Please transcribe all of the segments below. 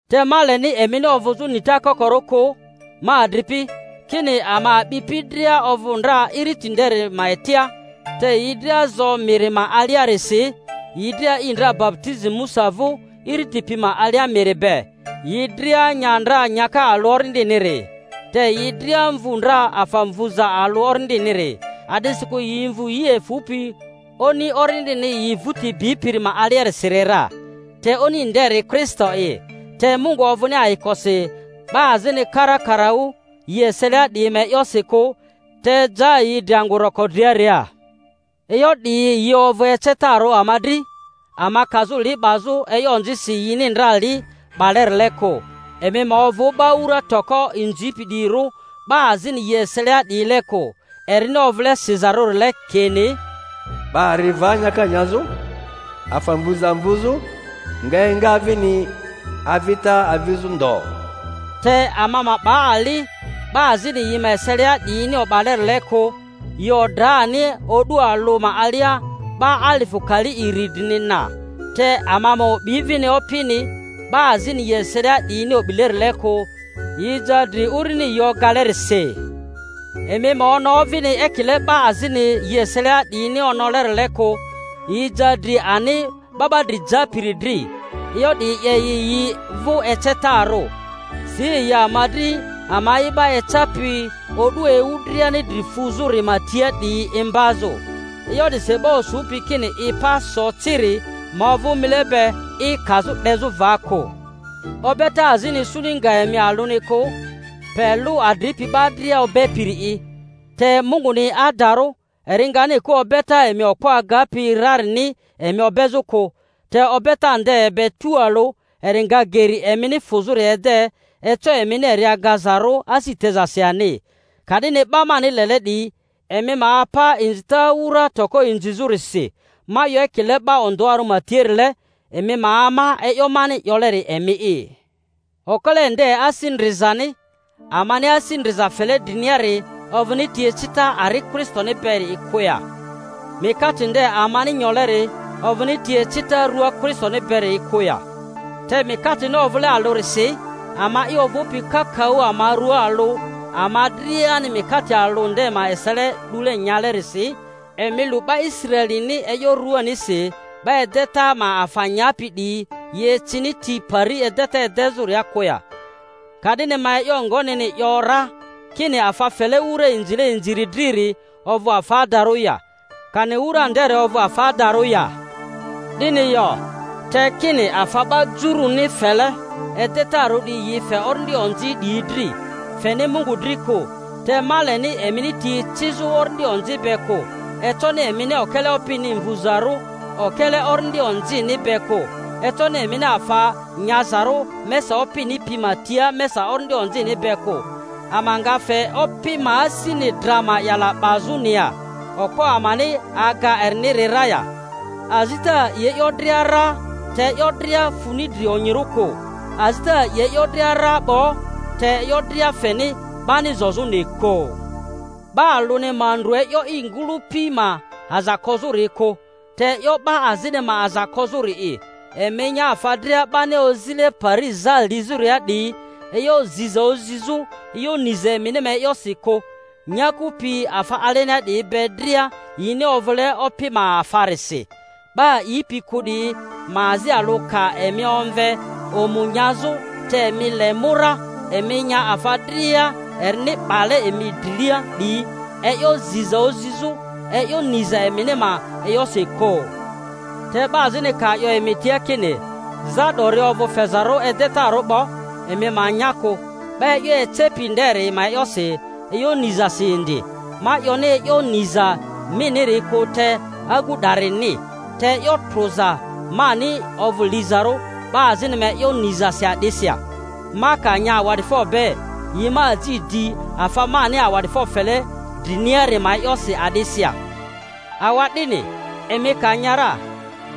Te ma leni emini ovᴜzᴜ nita kokorᴜ kᴜ, ma adripi, kini ama a'bipi dria ovᴜ ndra iriti nderi ma etia, te yi dria zo miri ma aliarisi, yi dria a'i ndra baputizi Musa vᴜ iriti pi ma alia miri be, yi dria nya ndra nyaka alᴜ orindiniri, te yi dria mvu ndra afa mvuza alᴜ orindiniri. A'disikᴜ yi mvu yi efᴜpi Oni orindini yi vᴜti bipiri ma aliasiri ra, te Oni nderi Kristo'i. Te Mungu ovᴜni ayikosi 'ba azini karakaraᴜ yi eselia 'diyi ma e'yosi kᴜ; te ja yi dri angᴜ roko driaria. E'yo 'diyi yi ovᴜ ecetarᴜ ama dri, ama kazᴜ li 'bazᴜ e'yo onzisi yini ndra li 'balerile kᴜ. Emi ma ovᴜ 'ba wura toko inzipi 'diyirᴜ, 'ba azini yi eselia 'diyile kᴜ; erini ovᴜle sizarᴜrile kini, 'Ba ri va nyaka nyazᴜ, afa mvuza mvuzᴜ, nga enga vini avita avizᴜ ndo. Te ama ma 'ba ali, 'ba azini yi ma eselia 'diyini o'balerile kᴜ; yi odra ani o'du alᴜ ma alia 'ba alifᴜ kali iri drini na. Te ama ma o'bi vini Opini, 'ba azini yi eselia 'diyini o'bilerile kᴜ; yi ja dri urini yi ogalerisi. Emi ma ono vini ekile 'ba azini yi eselia 'diyi-ni onolerile kᴜ; yi ja dri ani 'Ba 'ba dri Japiri dri. E'yo 'diyi 'ye yi yi vᴜ ecetarᴜ, si yi ama dri ama'i 'ba ecapi o'du ewu driani dri fuzᴜri ma tia 'diyi imbazᴜ. E'yo 'disi 'ba osupi kini i pa so ciri ma ovᴜ mile be i kazᴜ 'dezᴜ va kᴜ. Obeta azini isuni nga emi alᴜni kᴜ, pe lᴜ adripi 'ba dria obepiri'i. Te Munguni adarᴜ, eri ngani kᴜ obeta emi okpo agapi rarini emi obezᴜ kᴜ, te obeta nde be tualᴜ eri nga geri emini fᴜzᴜri ede, eco emini eri agazarᴜ asi tezasi ani. Ka'dini 'ba mani lele 'diyi, emi ma apa inzita wura toko inzizᴜrisi. Ma 'yo ekile 'ba ondᴜarᴜ ma tiarile; emi ma ama e'yo mani 'yoleri emi'i. Okele nde asi ndrizani amani asi ndriza fele driniari ovᴜni ti ecita ari Kristoni beri'i kᴜ ya? Mikate nde amani nyoleri ovᴜni ti ecita rua Kristoni beri'i kᴜ ya? Te mikatini ovᴜle alᴜrisi, ama'i ovᴜpi kakaᴜ ama rua alᴜ, ama driani mikate alᴜ nde ma esele 'dule nyale-risi. Emi lu 'ba lsraelini e'yo ruanisi; 'ba edeta ma afa nyapi 'diyi yi ecini ti pari edeta edezᴜria kᴜ ya? Ka'dini ma e'yo ngonini 'yo ra? Kini afa fele wura inzile inziri driri ovᴜ afa adarᴜ ya, kani wura nderi ovᴜ afa adarᴜ ya? 'Dini yo, te kini afa 'ba juruni fele edetarᴜ 'diyi yi fe orindi onzi 'diyi dri, feni Mungu dri kᴜ. Te ma leni emini ti ecizᴜ orindi onzi be kᴜ. Econi emini okele Opini mvuzarᴜ okele orindi onzini be kᴜ. Econi emini afa nyazarᴜ mesa Opini pi ma tia mesa orindi onzini be kᴜ. Ama nga fe Opi ma asini dra ma'yala 'bazᴜni ya? Okpo amani aga eriniri ra ya? Azita a'i e'yo dria ra, te e'yo dria funi dri onyirᴜ kᴜ. Azita a'i e'yo dria ra 'bo, te e'yo dria feni 'bani zozᴜni kᴜ. 'Ba alᴜni ma ndru e'yo i ngᴜlᴜpi ma aza kozᴜri kᴜ, te e'yo 'ba azini ma aza kozᴜri'i. Emi nya afa dria 'bani ozile pari za lizᴜria 'diyi, e'yo ziza ozizᴜ e'yo niza emini ma e'yosi kᴜ; nyaku pi afa alenia 'diyi be dria yini ovᴜle Opi ma afarisi. 'Ba a'ipi kᴜ 'diyi ma azi alᴜ ka emi omve omu nyazᴜ, te emi le mu ra, emi nya afa dria erini 'bale emi drilia 'diyi, e'yo ziza ozizᴜ e'yo niza emini ma e'yosi kᴜ. (Te 'ba azini ka 'yo emi tia kini, Za 'dori ovᴜ fezarᴜ edetarᴜ 'bo; emi ma nya kᴜ 'ba e'yo ecepi nderi ma e'yosi, e'yo nizasi indi ma 'yoni e'yo niza miniri kᴜ, te agu 'darini.) Te e'yo trᴜza mani ovᴜ lizarᴜ 'ba azini ma e'yo nizasi a'disi ya? Ma ka nya awa'difo be, yi ma aji di afa mani awa'difo fele driniari ma e'yosi a'disi ya? Awa'dini, emi ka nya ra,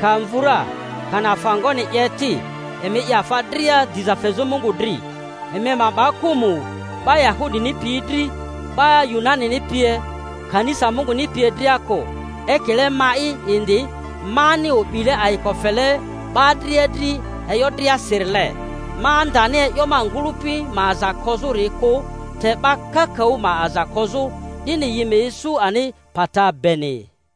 ka mvu ra, kani afa ngoni 'ye ti, emi 'ye afa dria diza fezᴜ Mungu dri. Emi ma 'ba kᴜmᴜ 'ba Yahudini piyi dri, 'ba Yunanini pie, kanisa Munguni pie dria kᴜ, ekile ma'i indi, mani o'bile ayiko fele 'ba dria dri e'yo driasirile, ma ndani e'yo ma ngᴜlᴜpi ma aza kozᴜri kᴜ te 'ba kakaᴜ ma aza kozᴜ, 'dini yi ma isu ani pata beni.